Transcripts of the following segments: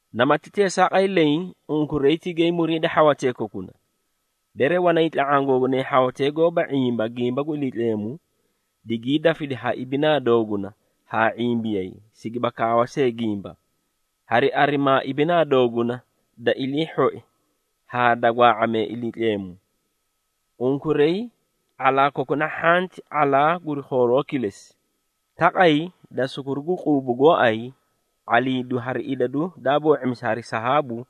Namati teesaaqay leẽ, unkuray tigay muriida hhawatee kokuna. Bere wanay tla⁄aã gooinay hhawatee goóba ⁄imba gimba gu Iliitleemu, digii dafidi ha ibinaa dooguna haa ⁄imbiyay, sigiba kaawa see gimba, hari arimaa ibinaa dooguna da ilii hhoi haa da gwaa⁄amee Iliitleemu. Unkuray ⁄alaa kokuna hhanti ⁄alaa guri khooroo kilesi, taqay da sukuru gu quubu gooay, ⁄aliidu hari idadu daa boo⁄imisi hari sahaabu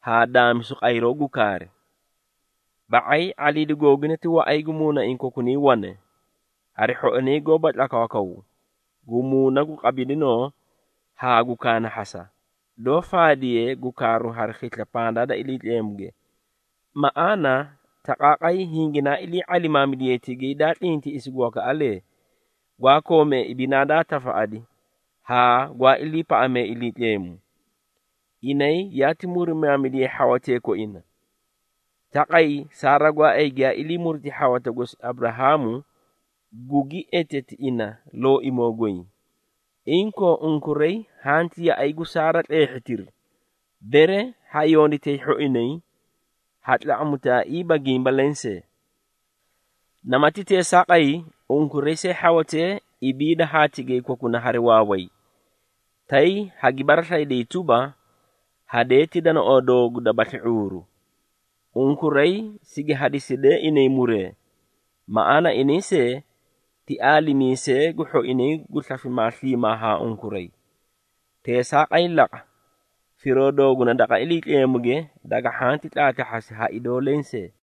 haa daamisa qayroo gu kaari. Ba⁄ay, ⁄aliidu googuna ti waꞌay gu muunaiĩ kokunay wane, hari hhoinay goóba tlakwaakwaw, gu muuna gu qabidinoo haa gu kaanahhasa, doó faadiye gu kaaru hari khisla pandaa da Iliitleemuge. Maꞌaana, taqaaqay hinginaa ilii ⁄alimaamidiyay tigay daa tlintiꞌisi gu wakaꞌalee, gwaa koomee ibinaa daa tafaꞌadi haa gwaa iliipaꞌamee Iliitleemu. Inay yaati murimaamidiyay hhawatee koinay. Taqay Saara gooay giyaa ilii muriti hhawata gosi Aburahaamu, gugi eteti ina “Looimoo goy.” Inkoo, unkuray hanti yaꞌay gu Saara tleehhitiri, bere ha yonditay hhoinay, ha tlaꞌamutaaiiba gimba lensee. Namati teesaaqay, unkuray see hhawatee, ibiida haa tigay kokuna hari waaway, tay hagi baraslayidayi tuba, hadee ti danaoo doogu dabasli ⁄uuru. Unkuray sigi hasidee inay muree, maꞌaana inay see, ti aalimiisee gu hhoinay gu slafimaa sliimaa haa unkuray. Teesaaqay laqa, firoo dooguna daqa Iliitleemuge, daga hhanti tlaatlahhasi ha idoo lensee.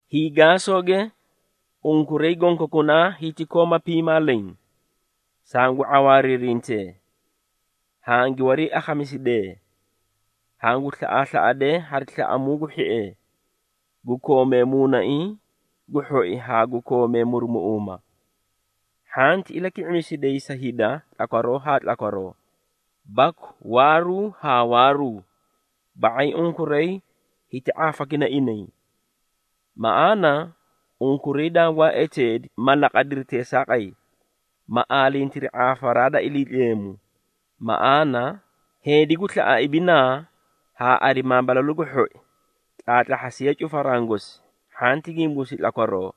Hiigaasooge, unkuray gonkokunaa hiti kooma piimaa leẽ. Sangu ⁄awaariirintee, hangi wariiakhamisidee, hangu slaꞌaaslaꞌadee hari slaꞌamuu gu hhiee, gu koomee muunaiĩ gu hhoi haa gu koomee murumuꞌuumaa. Hhanti ilaki⁄imisiday sa hida tlakwaroo haa tlakwaroo, baku waaruu haa waaruu, ba⁄ay unkuray hiti ⁄aafakina inay. Maꞌaana, unkuray dangwaa eteedi ma laqadiri teesaaqay, ma aalintiri ⁄aafaraa da Iliitleemu. Maꞌaana, Heedi gu slaꞌa ibinaa, haa arimaa balalu gu hhoi, tlaatlahhasiye cufaraã gosi hhanti gimbuusi tlakwaroo,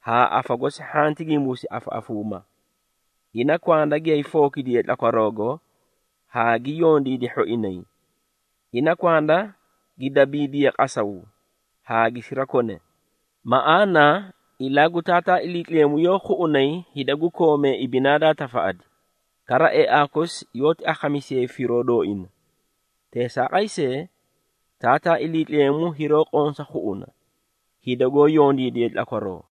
haa afa gosi hhanti gimbusi afaꞌafuuma. Ina kwanda giyaay fookidiye tlakwaroogo haa gi yondiidi hhoinay, ina kwanda gi dabiidiye qasaw haa gi sirakone. Maꞌaana, ilaa gu Taataa Iliitleemu yoó khuꞌunay hida gu koomee ibinaa daa tafaꞌadi, kara eaa kosi yoóti akhamisiyayi firoo dooina. Teesaaqay see, Taataa Iliitleemu hiroó qonsa khuꞌuna, hida goó yondiidee tlakwaroo.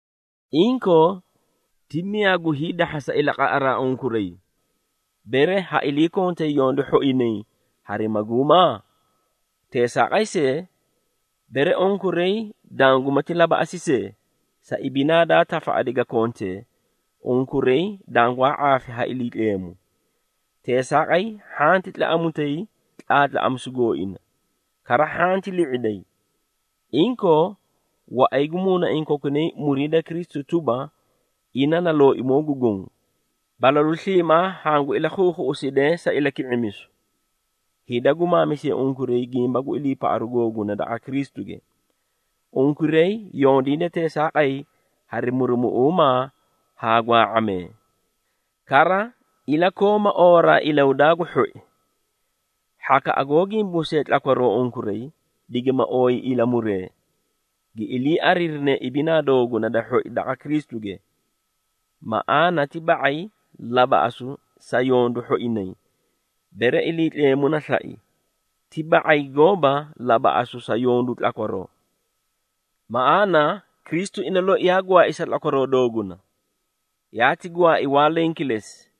Inkoo, ti miyaa gu hiidahhasa ilaqaꞌaraa unkuray, bere ha iliikontay yondu hhoinay hari maguuma? Teesaaqay see, bere unkuray dangumati labaꞌasi see, sa ibinaa daa tafaꞌadi ga kontee, unkuray dangwaa ⁄aafi ha Iliitleemu. Teesaaqay, hhanti tlaꞌamutay tlaatlaꞌamisu gooina, kara hhanti li⁄iday. Inkoo, waꞌay gu muunaiĩ kokunay muriida Kristu tuba, ina na Looimoo gu Goõ. Balalu sliimaa hangu ilakhuukhuꞌusidee sa ilaki⁄imisu, hida gu maamisee unkuray gimba gu iliipaꞌaru googuna daqa Kristuge. Unkuray yondiida teesaaqay hari murumuꞌuumaa haa gwaa⁄amee, kara ilakooma oowaraa ilahudaa gu hhoi. Hhakaꞌa goó gimbumisee tlakwaroo unkuray, digima ooyi ilamuree, gi ilii ariirinee ibinaa doogunay da hhoi daqa Kristuge. Maꞌaana, ti ba⁄ay labaꞌasu sa yondu hhoinay, bere Iliitleemu na slai, ti ba⁄ay gooba labaꞌasu sa yondu tlakwaroo. Maꞌaana, Kristu ina loi yaa gwaai sa tlakwaroo dooguna, yaati gwaai waa leẽ kilesi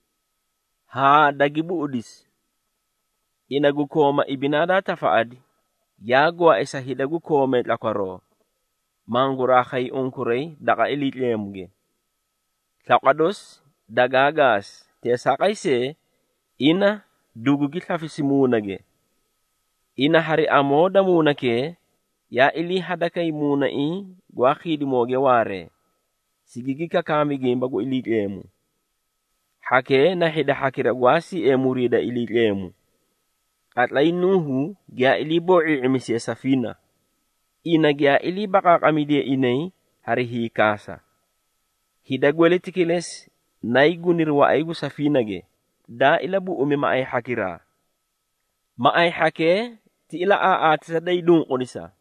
haa dagi buꞌudisi. Ina gu kooma ibinaa daa tafaꞌadi, yaa gwaai sa hida gu koomee tlakwaroo, manguraa khay unkuray daqa Iliitleemuge. Slaqwa dosi dagaa gaasi, teesaaqay see, ina dugugi slafisi muunage. Ina hari amoo da muunakee, yaa iliihadakay muunaiĩ gwaa khiidimooge waaree, sigigi kakaami gimba gu Iliitleemu. Hhakee na hida hhakira gwaa siee muriida Iliitleemu, qatlay Nuuhu giyaa ilii boo⁄ii⁄imisiye safiina. Ina giyaa ilii baqaaqamidiye inay hari hiikaasa. Hida gweleti kilesi naay guniri waꞌay gu safiinage, daa ilabuꞌumi maꞌay hhakiraa. Maꞌay hhakee ti ilaꞌaaꞌaatisa da hiinunqudisa,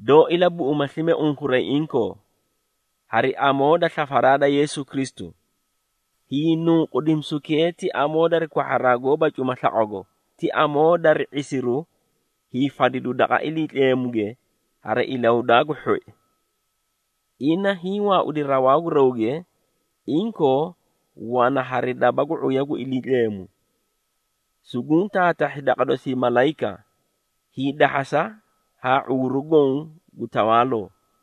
doó ilabuꞌuma slime unkuray inkoo, hari amoo da slafaraa da Yeesu Kristu. Hiinunqudimisukee ti amoo da kwahharaa gooba cuma slaqwago, ti amoo dari ⁄isiru hiifadidu daqa Iliitleemuge hari ilahudaa gu hhoi. Ina hiĩ waaudi rawaa gu rawge, inkoo, wana hari daba gu ⁄uya gu Iliitleemu. Sunguũ taatahhi daqa dosii malayika, hiidahhasa haa ⁄uuru goõ gu tawaaloo.